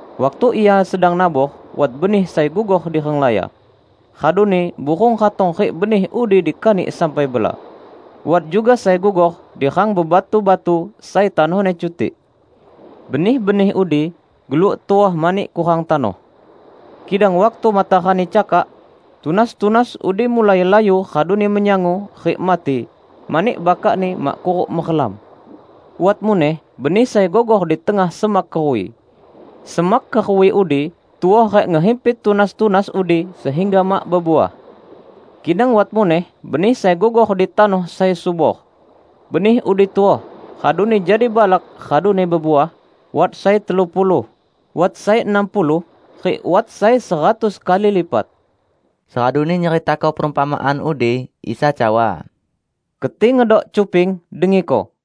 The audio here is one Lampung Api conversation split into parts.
Waktu ia sedang nabor, wat benih sai gugor di renglaya. Raduni burung ratong rik benih udi dikanik sampai bela. Wat juga sai gugor di rang bebatu-batu sai tanohni cutik. Benih-benih udi geluk tuoh mani kurang tanoh, kidang waktu matarani cakak, tunas-tunas udi mulai layu raduni menyangu rik mati mani bakakni mak kuruk merelam. Wat muneh benih sai gugor di tengah semak keruwi. Semak keruwi udi tuoh rik ngehimpit tunas-tunas udi sehingga mak bebuah. Kidang wat muneh benih sai gugor di tanoh sai subor. Benih udi tuoh, raduni jadi balak raduni bebuah, wat sai telu puluh, wat sai enam puluh, rik wat sai seratus kali lipat." Seraduni nyeritako perumpamaan udi, Isa cawa, "Keti ngedok cuping, dengiko!"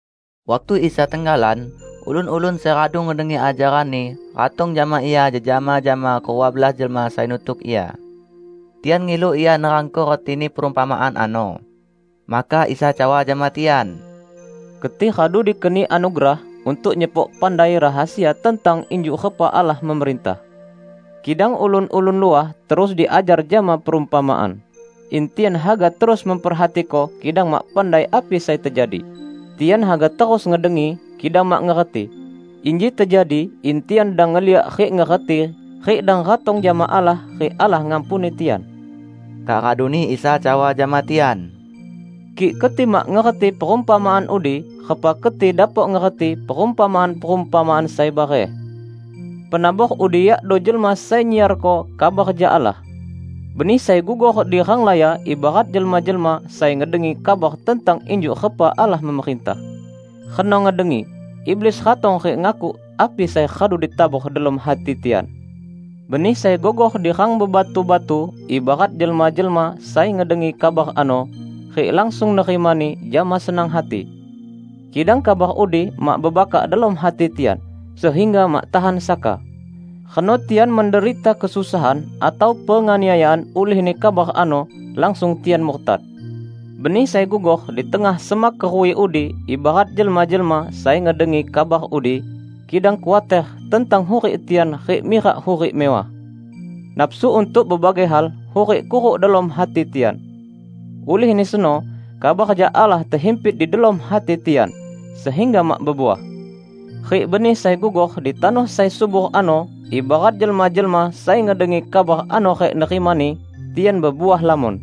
Waktu Isa tenggalan, ulun-ulun sai radu ngedengi ajaran-Ni ratong jama Ia jejama jama kerua belas jelma sai nutuk Ia. Tian ngilu Ia nerangko retini perumpamaan ano. Maka Isa cawa jama tian, "Keti radu dikeni anugerah untuk nyepok pandai rahasia tentang injuk repa Allah memerintah. Kidang ulun-ulun luah terus diajar jama perumpamaan, in 'Tian haga terus memperhatiko kidang mak pandai api sai tejadi, tian haga terus ngedengi, kidang mak ngerti, inji tejadi in tian dang ngeliak rik ngerti rik dang ratong jama Allah rik Allah ngampuni tian.' " Kak raduni Isa cawa jama tian, "Kik keti mak ngerti perumpamaan udi, repa keti dapok ngerti perumpamaan-perumpamaan sai bareh? Penabor udi yakdo jelma sai nyiarko kabar jak Allah. Benih sai gugor di renglaya ibarat jelma-jelma sai ngedengi kabar tentang injuk repa Allah memerintah. Reno ngedengi, iblis ratong rik ngakuk api sai radu ditabor delom hati tian. Benih sai gugor di rang bebatu-batu ibarat jelma-jelma sai ngedengi kabar ano, rik langsung nerimani jama senang hati. Kidang kabar udi mak bebakak delom hati tian, sehingga mak tahan saka. Reno tian menderita kesusahan atau penganiayaan ulihni kabar ano, langsung tian murtad. Benih sai gugor di tengah semak keruwi udi ibarat jelma-jelma sai ngedengi kabar udi, kidang khuater tentang hurik tian rik mirak hurik mewah. Nafsu untuk bebagai hal hurik kuruk delom hati tian. Ulihni seno kabar jak Allah tehimpit di delom hati tian, sehingga mak bebuah. Rik benih sai gugor di tanoh sai subor ano, ibarat jelma-jelma sai ngedengi kabar ano rik nerimani, tian bebuah lamon,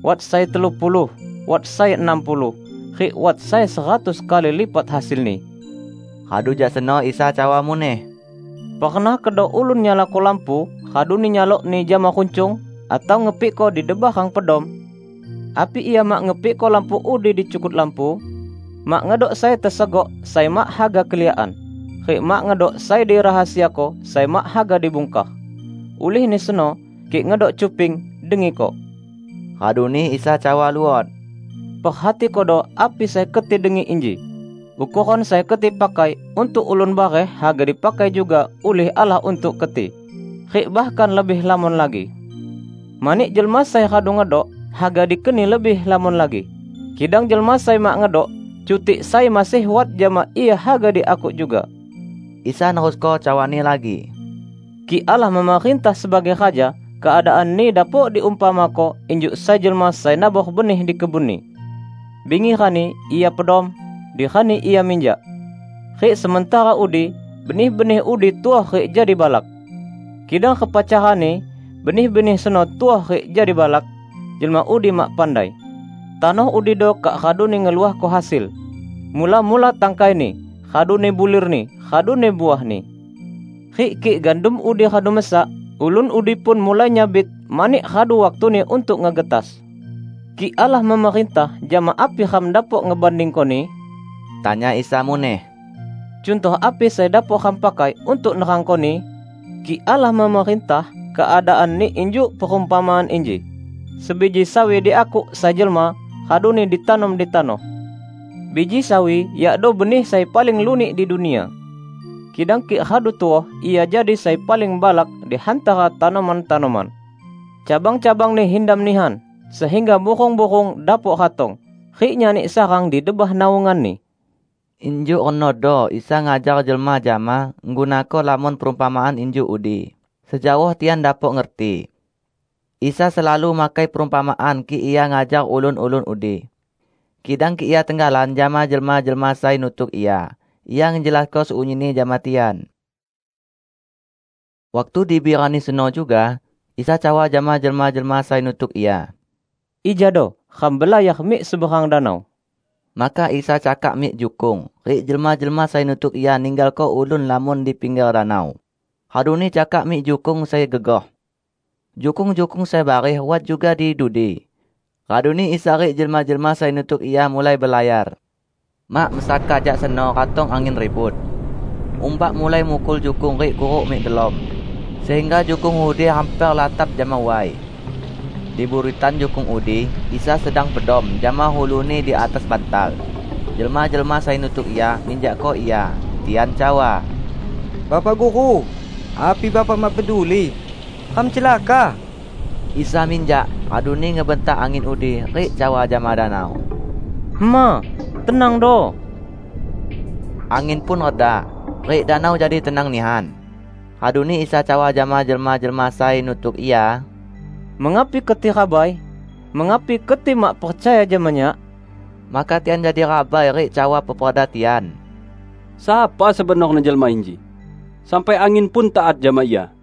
wat sai telu puluh, wat sai enam puluh, rik wat sai seratus kali lipat hasilni." Radu jak seno Isa cawa muneh, "Pernah kedo ulun nyalako lampu raduni nyalokni jama runcung, atau ngepikko di debah rang pedom? Api ia mak ngepikko lampu udi di cukut lampu? Mak ngedok sai tesegok sai mak haga keliakan; rik mak ngedok sai dirahasiako sai mak haga dibungkar. Ulihni seno, kik ngedok cuping, dengiko!" Raduni Isa cawa luot, "Perhatikodo api sai keti dengi inji! Ukoran sai keti pakai untuk ulun bareh haga dipakai juga ulih Allah untuk keti -- rik bahkan lebih lamon lagi. Mani jelma sai radu ngedok, haga dikeni lebih lamon lagi; kidang jelma sai mak ngedok, cutik sai masih wat jama ia haga diakuk juga." Isa nerusko cawa-Ni lagi, "Kik Allah memerintah sebagai Raja, keadaanni dapok diumpamako injuk sai jelma sai nabor benih di kebunni. Bingi rani ia pedom; di rani ia minjak. Rik sementara udi benih-benih udi tuoh rik jadi balak. Kidang repa carani benih-benih seno tuoh rik jadi balak, jelma udi mak pandai. Tanoh udido kak raduni ngeluahko hasil: mula-mula tangkaini, raduni bulirni, raduni uahni. Rik kik gandum udi radu mesak, ulun udi pun mulai nyabit mani radu waktuni untuk ngegetas." "Kik Allah memerintah, jama api ram dapok ngebandingkoni?" tanya Isa muneh. "Cuntoh api sai dapok ram pakai untuk nerangkoni? Kik Allah memerintah, keadaanni injuk perumpamaan inji: Sebiji sawi diakuk sai jelma raduni ditanom di tanoh. Biji sawi yakdo benih sai paling lunik di dunia. Kidang kik radu tuoh, ia jadi sai paling balak di hantara tanoman-tanoman. Cabang-cabangni hindam nihan sehingga burung-burung dapok ratong, rik nyani sarang di debah naunganni." Injuk renodo Isa ngajar jelma jama ngegunako lamon perumpamaan injuk udi, sejaoh tian dapok ngerti. Isa selalu makai perumpamaan kik Ia ngajar ulun-ulun udi. Kidang kik Ia tenggalan jama jelma-jelma sai nutuk Ia, Ia ngejelasko sunyinni jama tian. Waktu dibi rani seno juga, Isa cawa jama jelma-jelma sai nutuk Ia, "Ijado ram belayar mik seberang danau." Maka Isa cakak mik jukung, rik jelma-jelma sai nutuk Ia ninggalko ulun lamon di pingger danau, raduni cakak mik jukung sai gegoh. Jukung-jukung sai bareh wat juga di dudi. Raduni Isa rik jelma-jelma sai nutuk Ia mulai belayar. Mak mesaka jak seno ratong angin ribut. Umbak mulai mukul jukung rik kuruk mik delom sehingga jukung udi hamper latap jama way. Di buritan jukung udi, Isa sedang pedom jama ulu-Ni di atas bantal. Jelma-jelma sai nutuk Ia minjakko Ia. Tian cawa, "Bapak Guru, api Bapak mak peduli, ram celaka?" Isa minjak, raduni ngebentak angin udi, rik cawa jama danau, "Hema, tenangdo!" Angin pun reda, rik danau jadi tenang nihan. Raduni Isa cawa jama jelma-jelma sai nutuk Ia, "Mengapi keti rabai? Mengapi keti mak percaya jama Nyak?" Maka tian jadi rabai rik cawa peperda tian, "Sapa sebenorni jelma inji, sampai angin pun taat jama Ia."